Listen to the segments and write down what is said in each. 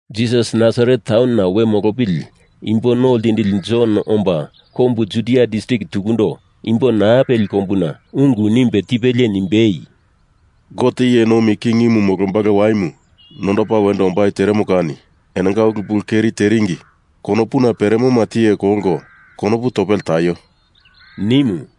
Jisas Nasaret taunona we molopili Imbo No Ltindili Jon omba kombu Judia distrik tukundo imbo naa peli kombuna ungu nimbe tipelie nimbei, “Gote iye nomi kingimu molombalo waimu nondopa wendo ombai teremo kani enonga ulu pulu keri teringi konopuna peremoma tiye kolko konopu topele taio,” nimu.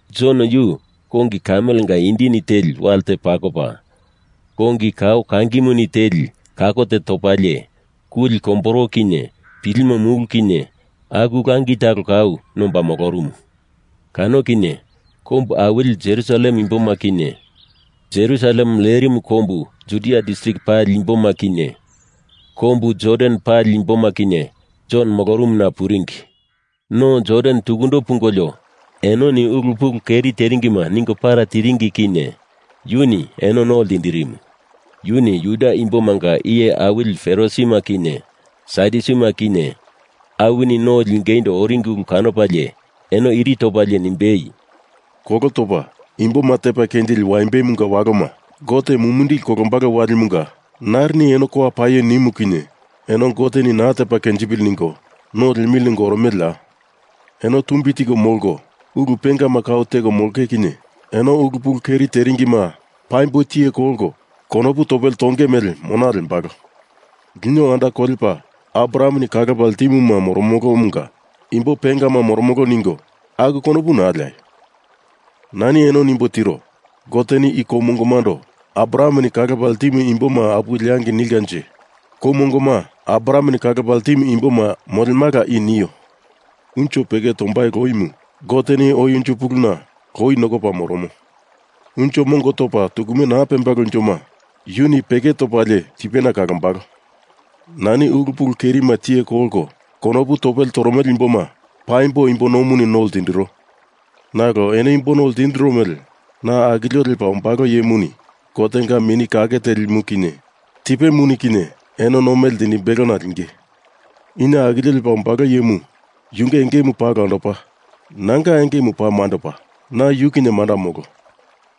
Jon yu kongi kamelenga indini teli wale te pakopa, kongi kao kangimuni teli kako te topalie, kuli komboro kinye pilimo mulu kinye aku langi talo kau nomba molorumu. Kano kinye kombu awili Jerusalem imboma kinye Jerusalem lerimu kombu Judia distrik pali imboma kinye kombu Jordan pali imboma kinye Jon molorumuna puringi. No Jordan tukundo pungolio enoni ulu pulu keri teringima ningo para tiringi kinye yuni eno no ltindirimu. Yuni Juda imbomanga iye awili Farisima kinye Sadyusima kinye awini no lingeindo oringi ulu kanopalie, eno iri topalie nimbei, “Kolo topa imboma tepa kenjili waimbemunga waloma, Gote mumindili kolombalo walimunga narini eno kowa paio nimu kinye eno Goteni naa tepa kenjipili ningo no liemili ningo oromeleya? Eno tumbi tiko molko, ulu pengama kau teko molonge kinye eno ulu pulu keri teringima paimbo tiye kolko konopu topele tonge mele mona lembalo. Lino anda kolepa Abrahameni kalopa ltimuma moromolomunga imbo pengama moromolo ningo aku konopu naa leaio. Nani eno nimbo tiro, Goteni i kou mongomando Abrahameni kalopa ltimu imboma apuwe leangei nilkanje kou mongoma Abrahameni kalopa ltimu imboma molemala i nio. Unjo peke tombai loimu Goteni oi unjo puluna loi nokopa moromo. Unjo mongo topa tukume naa pembalo unjoma yuni peke topalie tipena kalombalo. Nani ulu pulu kerima tiye kolko konopu topele toromele imboma paimbo imbo nomuni no ltindiro. Nalo eno imbo no ltindiro mele na akilio lepa ombalo iyemuni Gotenga Mini Kake Telimuni kinye tipemuni kinye eno no mele ltindimbelona linge. I na akilio lepa ombalo iyemu yunge engemu paa olandopa, nanga engemu paa mandopa. Na yu kinye manda molo.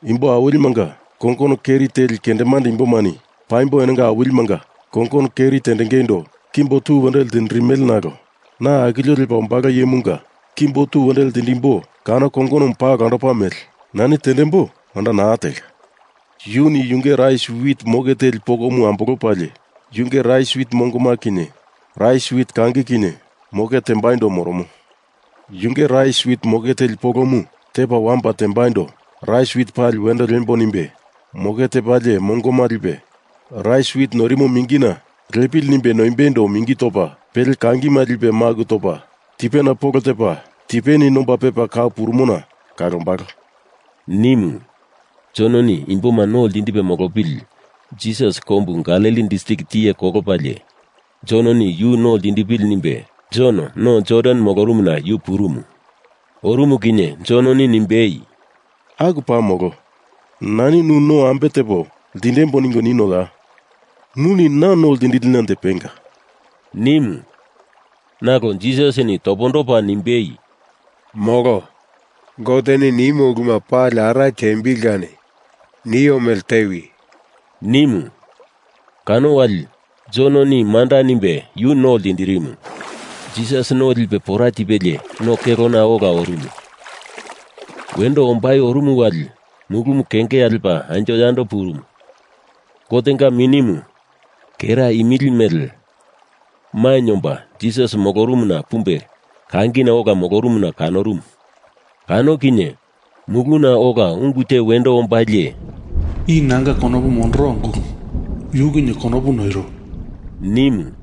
Imbo awilimanga kongono keri teli kendemande imbomani paimbo enonga awilimanga kongono keri tendengeindo kimbo tu wendo ltindirimele nalo na akilio lepa ombalo iyemunga kimbo tu wendo lindimbo kano kongonomu paa olandopa mele nani tendembo manda naa telka. Yuni yunge rais wit moke teli pokomu ambolopalie yunge rais wit mongo kinye rais wit kangi kinye moke tembaindo moromo. Yunge rais wit moke teli polomu tepa wamopa tembaindo rais wit pali wendo liembo nimbe moke tepalie mongoma lipe rais wit noirimo mingina lepili nimbe noimbeindo mingi topa, pele kangima lipe maku topa tipena polo tepa tipeni nomba pepa kau purumona kalombalo,” nimu. Jononi imboma no ltindipe molopili Jisas kombu Galili distrik tiye kolopalie, Jononi yu no lindipili nimbe Jon no Jordan molorumuna yu purumu. Orumu kinye Jononi nimbei, “Aku paa molo. Nani nu no ambe tepo lindembo ningo ninoya? Nuni na no lindilinanje penga,” nimu. Nalo Jisasini topondopa nimbei, “Molo. Goteni nimo uluma pali ara tiembili kani nio mele tewi,” nimu. Kano wali Jononi manda nimbe yu no ltindirimu. Jisas no lipe pora tipelie no kelona ola orumu. Wendo ombai orumu wali mulumu kengea lepa anjo yando purumu, Gotenga Minimu, kera imili mele, mainye omba Jisas molorumuna pumbe kangina ola molorumuna kanorumu. Kano kinye muluna ola ungu te wendo ombalie, “I nanga konopu mondoro Ungulumu. Yu kinye konopu noiro,” nimu.